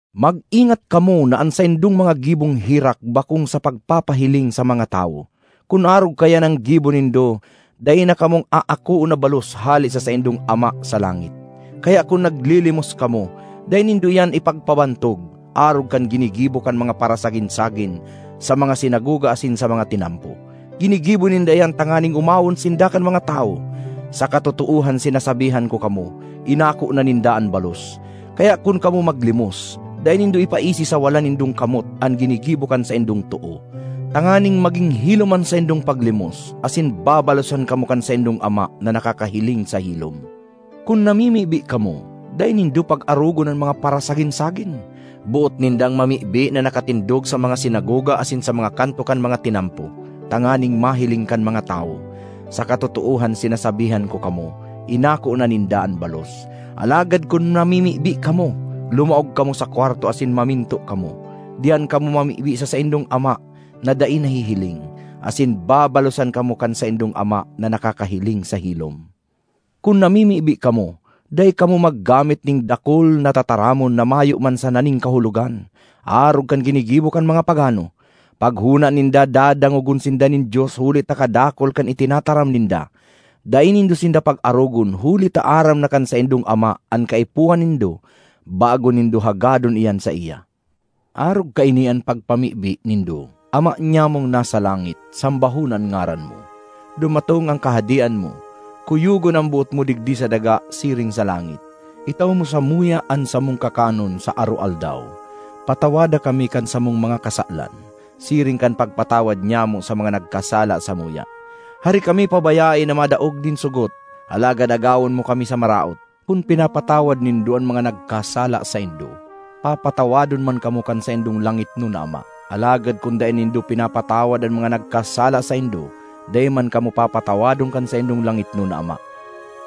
”Mag-ingat kamo na an saindong mga gibong herak bakong sa pagpahiling sa mga tawo. Kun arog kaiyan an gibo nindo, dai na kamong aakoon na balos hale sa saindong Ama sa langit. ”Kaya kun naglilimos kamo, dai nindo iyan ipagpabantog, arog kan ginigibo kan mga parasagin-sagin sa mga sinagoga asin sa mga tinampo. Ginigibo ninda iyan tanganing omawon sinda kan mga tawo. Sa katotoohan sinasabihan ko kamo, inako na ninda an balos. Kaya kun kamo maglimos, dai nindo ipaisi sa wala nindong kamot an ginigibo kan saindong too, tanganing magin hilom an saindong paglimos; asin babalosan kamo kan saindong Ama na nakakahiling sa hilom. ”Kun namimibi kamo, dai nindo pag-arogon an mga parasagin-sagin! Boot nindang mamibi na nakatindog sa mga sinagoga asin sa mga kanto kan mga tinampo tanganing mahiling kan mga tawo. Sa katotoohan sinasabihan ko kamo, inako na ninda an balos. Alagad kun namimibi kamo, lumaog kamo sa kwarto asin maminto kamo. Diyan kamo mamibi sa saindong Ama na dai nahihiling; asin babalosan kamo kan saindong Ama na nakakahiling sa hilom. ”Kun namimibi kamo, dai kamo maggamit nin dakul na tataramon na mayo man sana nin kahulogan, arog kan ginigibo kan mga pagano. Paghona ninda, dadangogon sinda nin Dios huli ta kadakul kan itinataram ninda. Dai nindo sinda pag-arogon huli ta aram na kan saindong Ama an kaipuhan nindo bago nindo hagadon iyan saiya. Arog kaini an pagpamibi nindo: ‘Ama nyamong nasa langit, Sambahon an ngaran mo; dumatong an kahadean mo; kuyogon an boot mo digdi sa daga siring sa langit. Itao mo samuya an samong kakanon sa aroaldaw. Patawada kami kan samong mga kasalan, siring kan pagpatawad nyamo sa mga nagkasala samuya. Hare kami pabayae na madaog nin sogot, alagad agawon mo kami sa maraot.’ ”Kun pinapatawad nindo an mga nagkasala saindo, papatawadon man kamo kan saindong langitnon na Ama. Alagad kun dai nindo pinapatawad an mga nagkasala saindo, dai man kamo papatawadon kan saindong langitnon na Ama.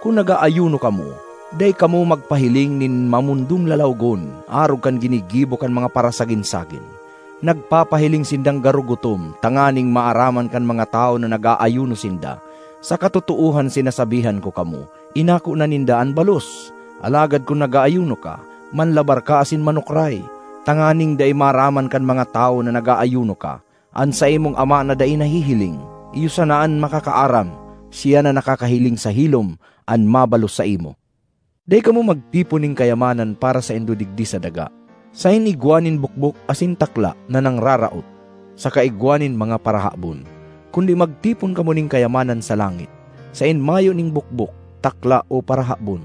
”Kun nag-aayuno kamo, dai kamo magpahiling nin mamondong lalawogon arog kan ginigibo kan mga parasagin-sagin. Nagpapahiling sindang garo gutom tanganing maaraman kan mga tawo na nag-aayuno sinda. Sa katotoohan sinasabihan ko kamo, inako na ninda an balos! Alagad kun nag-aayuno ka, manlabar ka asin manukray, tanganing dai maaraman kan mga tawo na nag-aayuno ka. An saimong Ama na dai nahihiling, iyo sana an makakaaram. Siya na nakakahiling sa hilom, an mabalos saimo. ”Dai kamo magtipon nin kayamanan para saindo digdi sa daga, saen igwa nin bokbok asin takla na nangraraot, saka igwa nin mga parahabon. Kundi, magtipon kamo nin kayamanan sa langit, saen mayo nin bokbok, takla o parahabon.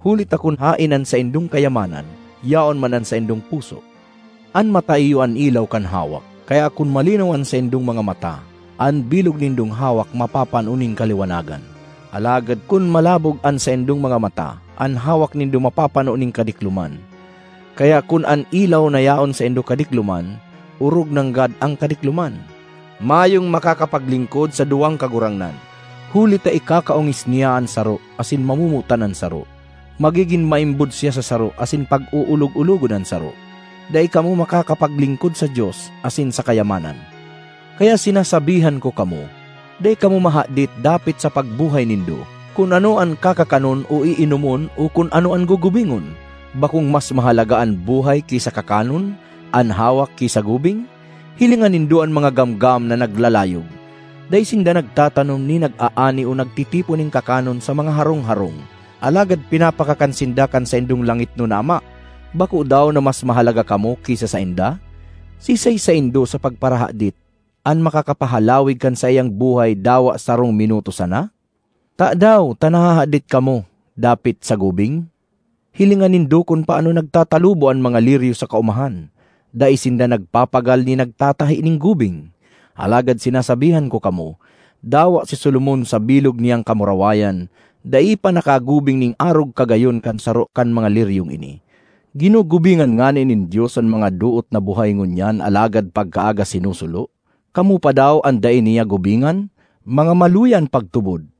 Huli ta kun haen an saindong kayamanan, yaon man an saindong puso. ”An mata iyo an ilaw kan hawak. Kaya kun malinaw an saindong mga mata, an bilog nindong hawak mapapano nin kaliwanagan. Alagad, kun malabog an saindong mga mata, an hawak nindo mapapano nin kadikloman. Kaya kun an ilaw na yaon saindo kadikloman, orog nanggad an kadikloman! ”Mayong makakapaglingkod sa duwang kagurangnan, huli ta ikakaongis niya an saro asin mamomotan an saro; magigin maimbod siya sa saro asin pag-oolog-ologon an saro. Dai kamo makakapaglingkod sa Dios asin sa kayamanan. ”Kaya sinasabihan ko kamo, dai kamo mahadit dapit sa pagbuhay nindo, kun ano an kakakanon o iinomon o kun ano an gugubingon. Bakong mas mahalaga an buhay ki sa kakanon; an hawak ki sa gubing? Hilinga nindo an mga gamgam na naglalayog: dai sinda nagtatanom ni nag-aani o nagtitipon nin kakanon sa mga harong-harong; alagad pinapakakan sinda kan saindong langitnon na Ama! Bako daw na mas mahalaga kamo ki sa sainda? Siisay saindo, sa pagparahadit, an makakapahalawig kan saiyang buhay dawa sarong minuto sana? ”Tadaw ta nahahadit kamo dapit sa gubing? Hilinga nindo kun paano nagtatalubo an mga liryo sa kaomahan: dai sinda nagpapagal ni nagtatahi nin gubing. Alagad sinasabihan ko kamo, dawa si Solomon sa bilog niyang kamurawayan, dai pa nakagubing nin arog kagayon kan saro kan mga liryong ini. Ginugubingan ngani nin Dios an mga doot na buhay ngunyan alagad pagkaaga sinusulo, kamo pa daw an dai niya gubingan? Mga maluya an pagtubod!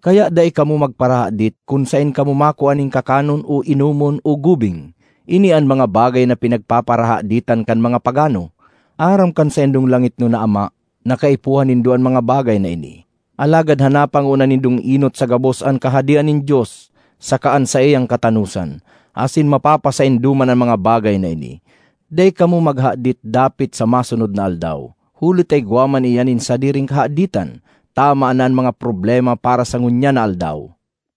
Kaya dai kamo magparahadit kun saen kamo makua nin kakanon o inomon o gubing. Ini an mga bagay na pinagpaparahaditan kan mga pagano. Aram kan saindong langitnon na Ama na kaipuhan nindo an mga bagay na ini. Alagad hanapa ngona nindong enot sa gabos an Kahadean nin Dios saka an saiyang katanosan, asin mapapasaindo man an mga bagay na ini. Dai kamo maghadit dapit sa masunod na aldaw; huli ta igwa man iyan nin sadiring kahaditan. Tama na an mga problema para sa ngunyan na aldaw.